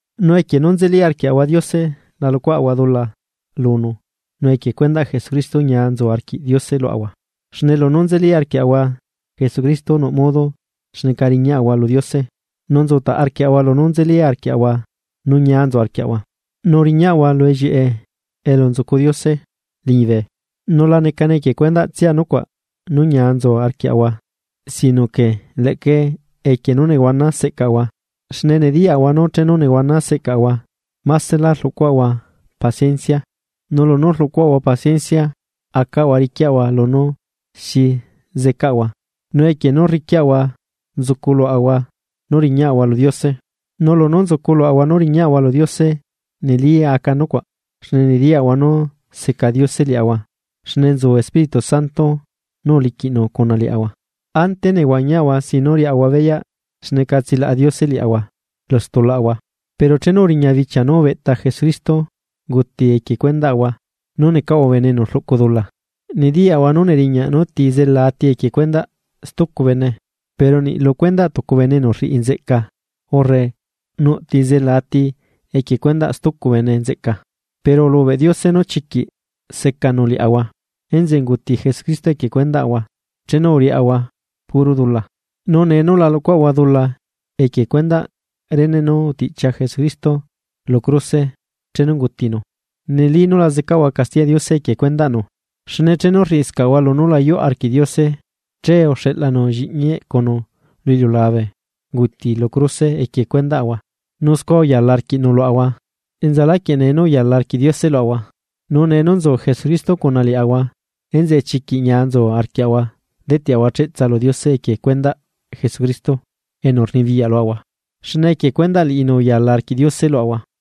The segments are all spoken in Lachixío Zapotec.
Nu equie nú nzeli arquiaꞌahua Diose la luꞌcuaꞌahua dula lunu, nu equie cuendaꞌ Jesucristo ñia nzu arquiꞌ Diose luaꞌahua. Xne lunú nzeli arquiaꞌahua Jesucristo nuꞌ modo xneca riñaꞌahua lu Diose, nu nzutaꞌ arquiaꞌahua lunú nzeli arquiaꞌahua nu ñia nzu arquiaꞌahua, nu riñaꞌahua lu ellieꞌe elu nzucu Diose liñibe. Nu la necane equie cuendaꞌtsia nucuaꞌ nú ñia nzu arquiaꞌahua sino que leꞌca equie nú nehuana seꞌcaꞌahua, xne nediyaꞌahua nú chenu nehuana seꞌcaꞌahua másela rluꞌcuaꞌahua paciencia. Nu lunú rluꞌcuaꞌahua paciencia acaꞌahua riquiaꞌahua lunú xi zeꞌcaꞌahua, nu equie nú rriquiaꞌahua nzucu luaꞌahua nú riñaꞌahua lu Diose. Nu lunú nzucu luaꞌahua nú riña'ahua lu Diose neli aca nucuaꞌ, xne nediyaꞌahua nú seca Diose liaꞌahua xne nzu Espíritu Santo nú uliquiꞌnu cuna liaꞌahua. Ante nehuañiaꞌahua sin nú riaꞌahua beyaꞌ xneca tsilaꞌa Diose liaꞌahua lu stulaꞌahua, pero chenu uriña bichia nú ubeꞌta Jesucristo unguti equie cuendaꞌahua nú necaꞌahua bene enu rluꞌcu dula. Nediyaꞌahua nú neriñaꞌ nú ti zela ati equie cuendaꞌ stucu bene, pero niꞌ lu cuendaꞌ tucu bene enu rriꞌi nzeꞌca urre nuꞌ ti zela ati equie cuendaꞌ stucu bene nzeꞌca. Pero ulubeꞌ Diose nú chiquiꞌ secanu liaꞌahua enzeꞌe unguti Jesucristo equie cuendaꞌahua chenu uriaꞌahua puro dula. Nu nee nú la luꞌcuaꞌahua dula equie cuendaꞌ rene nú utiꞌchia Jesucristo lu cruse chenu ungutinu, neli nú la zecaꞌahua castiyaꞌ Diose equie cuendaꞌnu. Xne chenu rriꞌscaꞌahua lunú la yuꞌ arquiꞌ Diose che uxeꞌlanu lliꞌñi eꞌcunu lu iliulabe unguti lu cruse equie cuendaꞌahua nu scua uyala arquiꞌnu luaꞌahua enzaláquieꞌ nee nú uyala arquiꞌ Diose luaꞌahua. Nu nee nú nzu Jesucristo cuna liaꞌahua, enzeꞌe chiquiꞌ ñia nzu arquiaꞌahua deteꞌahua cheꞌtsa lu Diose equie cuendaꞌ Jesucristo enu rnibiyaꞌ luaꞌahua, xne equie cuendaꞌ liꞌinu uyala arquiꞌ Diose luaꞌahua.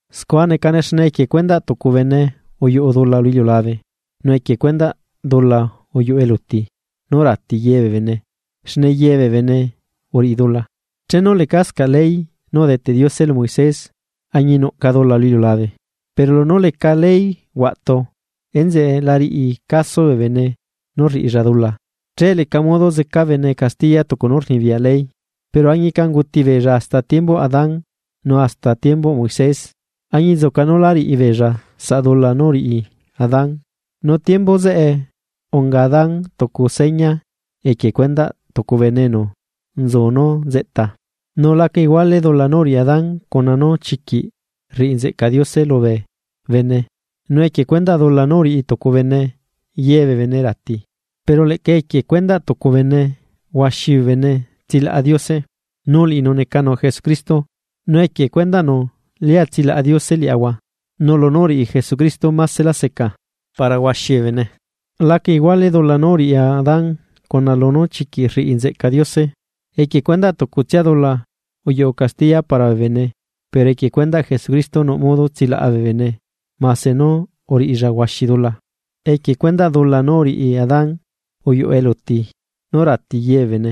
Scua necane xne equie cuendaꞌ tucu bene uyuꞌu dula lu iliulabe, nu equie cuendaꞌ dula uyuꞌu eluti, nú rati ye bee bene xne ye bee bene uriꞌi dula. Chenu lecascaꞌ ley nú udeteꞌ Diose lu Moisés añinuꞌca dula lu iliulabe, pero lunú leca ley huaꞌtu enzeꞌe la riꞌi caso bee bene nú rriꞌilla dula. Che leca modo zeca bene castiya tucu nú rnibiyaꞌ ley. Pero añica unguti beella hasta tiembuꞌ Adán nu hasta tiembuꞌ Moisés, añinzuca nú lá riꞌi beella saꞌ dula nú uriꞌi Adán, nu tiembu zeꞌe unga Adán tucu seña equie cuendaꞌ tucu bene enu nzu nú nzeꞌta. Nu laca iguale dula nú uriꞌi Adán, cuna nú chiquiꞌ rriꞌi nzeꞌca Diose lubee bene, nu equie cuendaꞌ dula nú uriꞌi tucu bene ye bee bene rati, pero leꞌca equie cuendaꞌ tucu bene huaxi bee bene tsilaꞌa Diose, nu liꞌinu necanu Jesucristo, nu equie cuendaꞌnu lia tsilaꞌa Diose liaꞌahua. Nu lunú uriꞌi Jesucristo másela seca para huaxi bee bene. Laca iguale dula nú uriꞌi Adán cuna lunú chiquiꞌ rriꞌi nzeꞌca Diose. equie cuendaꞌ tucutsia dula, uyuꞌu castiya para bee bene pero equie cuendaꞌ Jesucristo nuꞌ modo tsilaꞌa bee bene mase nú uriꞌilla huaxi dula. Equie cuendaꞌ dula nú uriꞌi Adán, uyuꞌu eluti nú rati ye bee bene,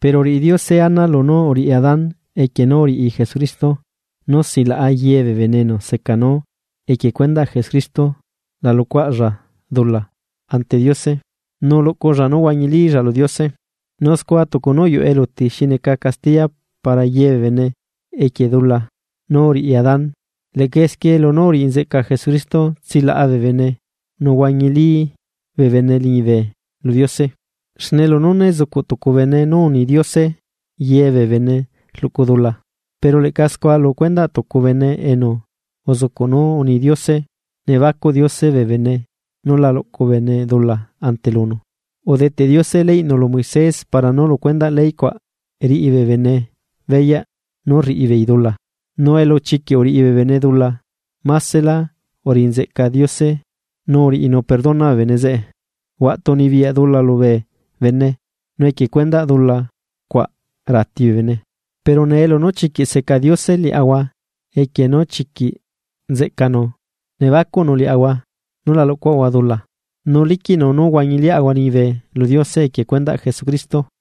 pero uriꞌi Diose ana lunú uriꞌi Adán equie nú uriꞌi Jesucristo nú silaꞌa ye bee bene enu seca nú equie cuendaꞌ Jesucristo la luꞌcuaꞌlla dula ante Diose nu luꞌculla nú huañilílla lu Diose. Nu scua tucu nú uyuꞌu eluti xi neca castiya para ye bee bene equie dula nú uriꞌi Adán, leꞌca esquie lunú uriꞌi nzeꞌca Jesucristo tsilaꞌa bee bene nu huañilí bee bene liñibe lu Diose. Xne lunú né zucuꞌ tucu bene nú uni Diose ye bee bene rluꞌcu dula, pero leꞌca scua lu cuendaꞌ tucu bene enu uzucuꞌ nú uni Diose nebacuꞌ Diose bee bene nú la luꞌcu bene dula ante lunu. Udeteꞌ Diose leyꞌnu lu Moisés para nú lu cuendaꞌ ley cuaꞌ riꞌi bee bene beyaꞌ nú rriꞌi beei dula, nu elu chiquiꞌ uriꞌi bee bene dula másela uriꞌi nzeꞌca Diose nu uriꞌinu perdona bee bene zeꞌe. Huaꞌtu unibiyaꞌ dula lubee bene nu equie cuendaꞌ dula cuaꞌ rati bee bene, pero nee lunú chiquiꞌ seca Diose liaꞌahua equie nú chiquiꞌ nzeꞌcanu nebacuꞌnu liaꞌahua nú la luꞌcuaꞌahua dula, nu liquiꞌnu nú huañiliaꞌahua liñibe lu Diose equie cuendaꞌ Jesucristo.